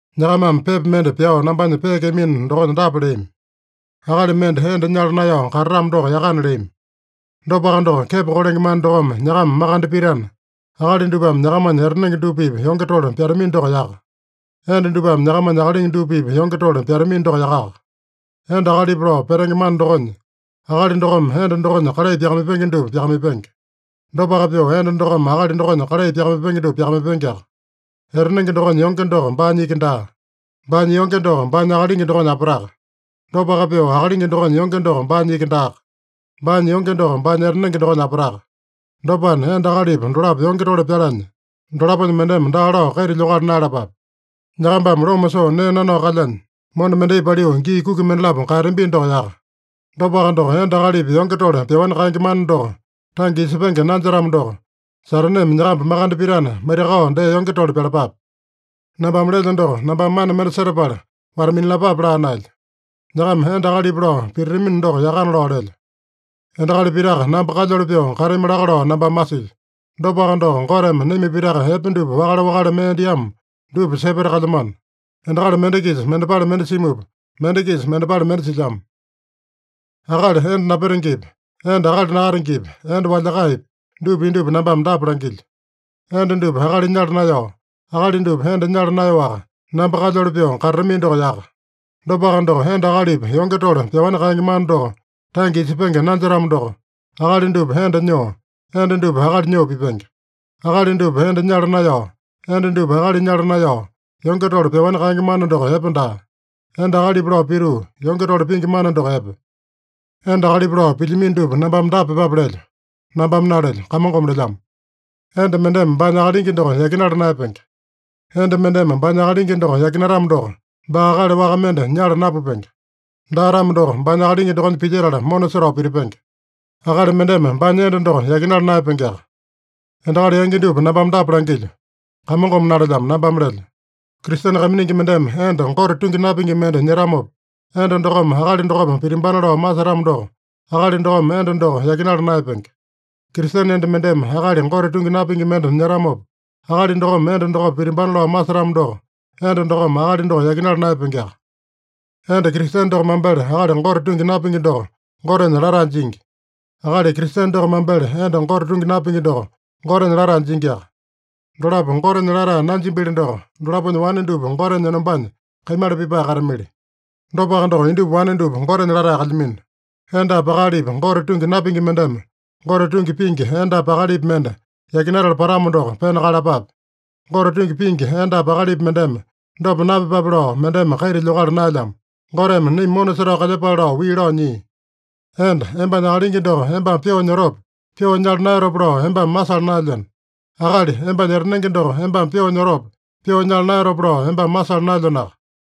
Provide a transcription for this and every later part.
Nyakamame pepa mende pyao nambanya peekeamino dokonya dapa leami: “Akali mende enda nyala naeyao katatamo doko yakana” leami. Dopaka doko, kepo kolenge mana dokome nyakama makande pitana, akali dupame nyakamanya etanenge dupa-pipa yonge tole pyatamino doko yaka. Enda dupame nyakamanya akalingi dupa-pipa yonge tole pyatamino doko yakaka. Enda akalipa lao petenge mana dokonya, akali dokome enda dokonya kalai pyakamaipenge dupa pyakamaipenge. Dopaka pyoo, enda dokome akalingi dokonya kalai pyakamaipenge dupa pyakamaipengeaka. Etanenge dokonya yonge doko baanya iki daa. Baanya yonge doko baanya akalingi dokonya apataka. Dopaka pyoo, akalingi dokonya yonge doko baanya iki daaka. Baanya yonge doko baanya etanenge dokonya apataka. Dopana, enda akalipa dolapo yonge tole pyalanya, dolaponya mendeme daa lao kaita lyokala naeyalapape. Nyakambame loma soo nee nanao kalyanya, mona mendai paliu gii kuki mendalapo kaeyatambino doko yaka. Dopaka doko, enda akalipa yonge tole pyaowani kaenge mana doko tange isepenge nanjetamo doko, Sataneme nyakamba makande pitana, maitakao dee yonge tole pyalapape. Nambame lelyo doko, nambame mana mende setapala wata-minalapape laa naelyo. Nyakama enda akalipa lao pititamino doko yakana lao lelyo. Endakali pitaka namba kalyoli pyoo katami laka lao nambame masilyo. Dopaka doko, Goteme naima pitaka epe dupa wakale-wakale mee diamo dupa sepeta kalyamano. Endakali mende-kisa mendepale mende simupa, mende-kisa mendepale mende silyamo. Akali enda napetengepi, enda akali nakatengepi, enda walyakaepi, dupa indupa nambame dapa langilyo: Enda dupa akali nyala naeyao, akali dupa enda nyala naeyaowaka, namba kalyoli pyoo katatamino doko yaka. Dopaka doko, enda akalipa yonge tole pyaowani kaenge mana doko tange isepenge nanjetamo doko, akali dupa enda nyoo, enda dupa akali nyoo pipenge. Akali dupa enda nyala naeyao, enda dupa akali nyala naeyao, yonge tole pyaowani kaenge mana doko epe daa. Enda akalipa lao pituu, yonge tole pingi mana doko epe. Enda akalipa lao pilyamino dupa nambame dapa pyepape lelyo. (Nambame nalelyo. Kamongome lelyamo.) Enda mendeme baanya akalingi doko yakinala naeyapenge. Enda mendeme baanya akalingi doko yakinatamo doko, baa akali waka mende nyala napupenge. Daa-tamo doko, baanya akalingi dokonya pilyetala mona setao pitipenge. Akali mendeme baanya enda doko yakinala naeyapengeaka. Endakali yangi dupa nambame dapa langilyo. (Kamongome nalelyamo. Nambame lelyo.) Kristene kaiminingi mendeme enda Gote tungi napingi mende nyetamopa, enda dokome akali dokopa pitimbana lao masetamo doko, akali dokome enda doko yakinala naeyapenge. Kristene enda mendeme akali Gote tungi napingi mende nyetamopa, akali dokome enda dokopa pitimbana lao masetamo doko, enda dokome akali doko yakinala naeyapengeaka. Enda Kristene doko mambele akali Gote tungi napingi doko Gotenya latae jingi. Akali Kristene doko mambele enda Gote tungi napingi doko Gotenya latae jingiaka. Dolapo Gotenya latae nanjimbili doko, dolaponya wane dupa Gotenya enombanya kaimala pipae katamili. Dopaka doko, indupa wane dupa Gotenya latae kalyamino. Endapi akalipi Gote tungi napingi mendeme Gote tungi pingi endapi akalipi mende yakinatala patamo doko, pena kaeyalapape. Gote tungi pingi endapi akalipi mendeme dopa napyepape lao mendeme kaita lyokala naelyamo. Goteme naima mona setao kalyepale lao wii lao nyia. Enda, embanya akalingi doko embame pyoo nyotope, pyoo nyala naeyatope lao embame masala naelyeno. Akali, embanya etanenge doko embame pyoo nyotope, pyoo nyala naeyatope lao embame masala naelyenoaka.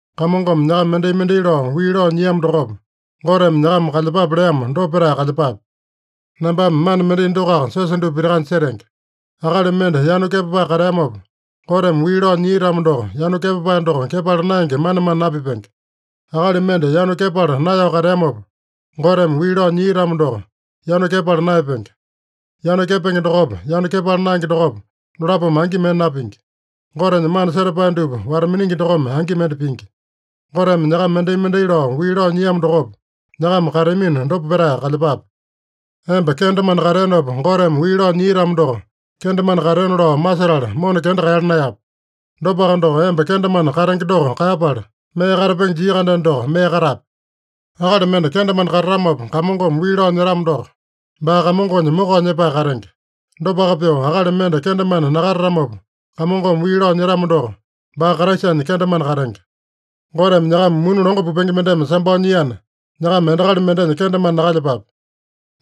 Kamongome nyakama mendai-mendai lao wii lao nyiamo dokopa, Goteme nyakama kalyepape leamo, dopa petae kalyepape. Nambame mana mendai dokoaka siosa dupa pitakanya setenge. Akali mende yanu kepapae kateamopa, Goteme wii lao nyia-tamo doko, yanu kepapae doko kepala naenge manemane napipenge. Akali mende yanu kepala naeyao kateamopa, Goteme wii lao nyia-tamo doko, yanu kepala naeyapenge. Yanu kepenge dokopa, yanu kepala naenge dokopa, dolapome angi mende napingi. Gotenya mana setapae dupa wata-miningi dokome angi mende pingi. Goteme nyakama mendai-mendai lao wii lao nyiamo dokopa, nyakama kateamino, dopa petae kalyepape. Emba kendemane kateenopa Goteme wii lao nyia-tamo doko, kendemane kateona lao masetala mona kenda kaeyala naeyape. Dopaka doko, emba kendemane katenge doko kaeyapala, mee katapenge jia-kandeno doko, mee katape. Akali mende kendemane katatamopa Kamongome wii lao nyetamo doko, baa Kamongonya mokao nyepae katenge. Dopaka pyoo, akali mende kendemane nakatatamopa Kamongome wii lao nyetamo doko, baa Kraisanya kendemane katenge. Goteme nyakama muni longo pupenge mendeme sambao nyiana, nyakama endakali mendenya kendemane nakalyepape.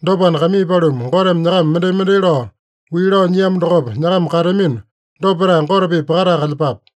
Dopana, kaimii paluma, Goteme nyakama mendai-mendai lao wii lao nyiamo dokopa, nyakama kateamino, dopa petae Gote-pipa pakatae kalyepape.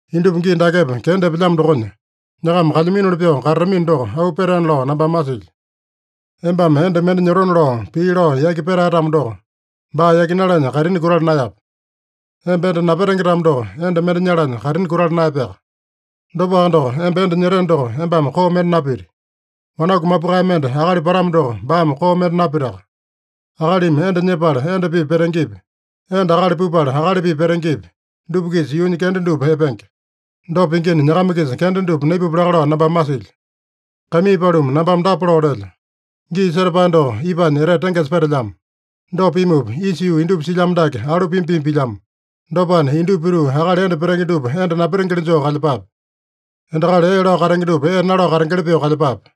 Indupa gii dakepa kenda epelyamo dokonya, nyakama kalyaminoli pyoo katatamino doko, auu petaena lao nambame masilyo. Embame enda mende nyotona lao, pii lao yaki petae-tamo doko, baa yakinalanya kaitini kutala naeyape. Emba enda napetenge-tamo doko, enda mende nyalanya kaitini kutala naeyapeaka. Dopaka doko, emba enda nyeteno doko, embame koo mende napiti. Wanaku mapukae mende akali patamo doko, baame koo mende napitaka. Akalimi enda nyepala enda-pipa petengepi, enda akali pupala akali-pipa petengepi, dupa-kisa yuunya kenda dupa epenge. Dopa pingina, nyakama-kisa kenda dupa naipupya laka lao nambame masilyo. Kaimii paluma, nambame dapa lao lelyo: Gii setapae doko ipanya etete tengesa petelyamo. Dopa pimupa, isa yuu indupa silyamo dake alu pima-pima pilyamo. Dopana, indupa pituu akali enda petenge dupa enda napetengeli joo kalyepape. Endakali ee lao katenge dupa ee nalao katengeli pyoo kalyepape.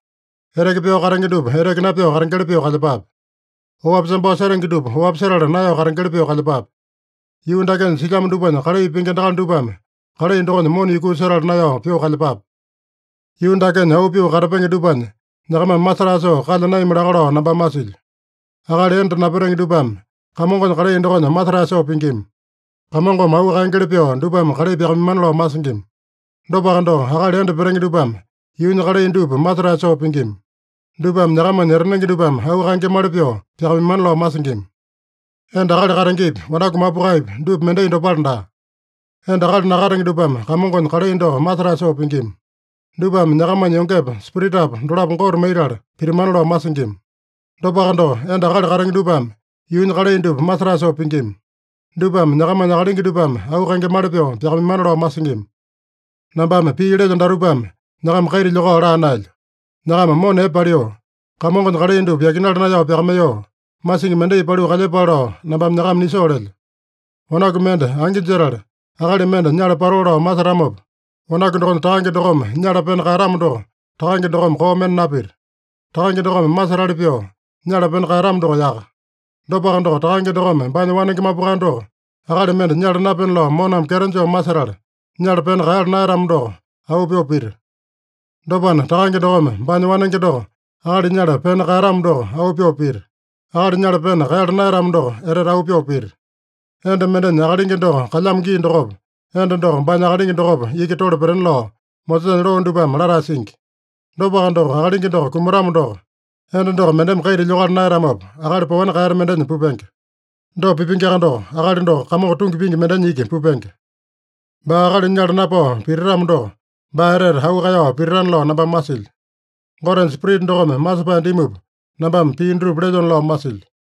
Eteke pyao katenge dupa eteke napyao katengeli pyoo kalyepape. Oapi sambao setenge dupa oapi setala naeyao katengeli pyoo kalyepape. Yuu dakenya silyamo dupanya kalai pingi endakali dupame kalai dokonya mona yukuu setala naeyao pyoo kalyepape. Yuu dakenya auu pyoo katapenge dupanya nyakamame masetae soo kalya naeyami laka lao nambame masilyo. Akali enda napetenge dupame Kamongonya kalai dokonya masetae soo pingima. Kamongome auu kaengeli pyoo dupame kalai pyakamaimana lao masingima. Dopaka doko, akali enda petenge dupame yuunya kalai dupa masetae soo pingima. Dupame nyakamanya etanenge dupame auu kaengemali pyoo pyakamaimana lao masingima. Enda akali katengepi, wanaku mapukaepi, dupa mendai dopale daa. Enda akali nakatenge dupame Kamongonya kalai doko masetae soo pingima. Dupame nyakamanya yongepa, spiritapa dolapo Gote maitala pitimana lao masingima. Dopaka doko, enda akali katenge dupame yuunya kalai dupa masetae soo pingima. Dupame nyakamanya akalingi dupame auu kaengemali pyoo pyakamaimana lao masingima. Nambame pii lelyo datupame nyakama kaita lyokao laa naelyo. Nyakama mona epe paliu, Kamongonya kalai dupa yakinala naeyao pyakamaiyoo, masingi mendai paliu kalyepale lao, nambame nyakama nisoo lelyo. Wanaku mende angi jetala, akali mende nyala patoo lao masetamopa, wanaku dokonya takange dokome nyala pena kaeyatamo doko, takange dokome koo mende napita. Takange dokome masetali pyoo nyala pena kaeyatamo doko yaka. Dopaka doko, takange dokome baanya wanenge mapukae doko akali mende nyala napena lao moname kyeto joo masetala, nyala pena kaeyala naeyatamo doko auu pyoo pita. Dopana, takange dokome baanya wanenge doko akali nyala pena kaeyatamo doko auu pyoo pita. Akali nyala pena kaeyala naeyatamo doko etete auu pyoo pita. Enda mendenya akalingi doko kalyamo gii dokopa, enda doko baanya akalingi dokopa iki tole petena lao Mosesanya loo dupame latae singi. Dopaka doko, akalingi doko kumatamo doko, enda doko mendeme kaita lyokala naeyatamopa, akali paowani kaeyata mendenya pupenge. Dopa pipengeaka doko, akali doko Kamongo tungi pingi mendenya iki pupenge. Baa akali nyala napao pititamo doko, baa etete auu kaeyao pititana lao nambame masilyo. Gotenya Spirita dokome masepae dimupa, nambame pii dutupa lelyona lao masilyo.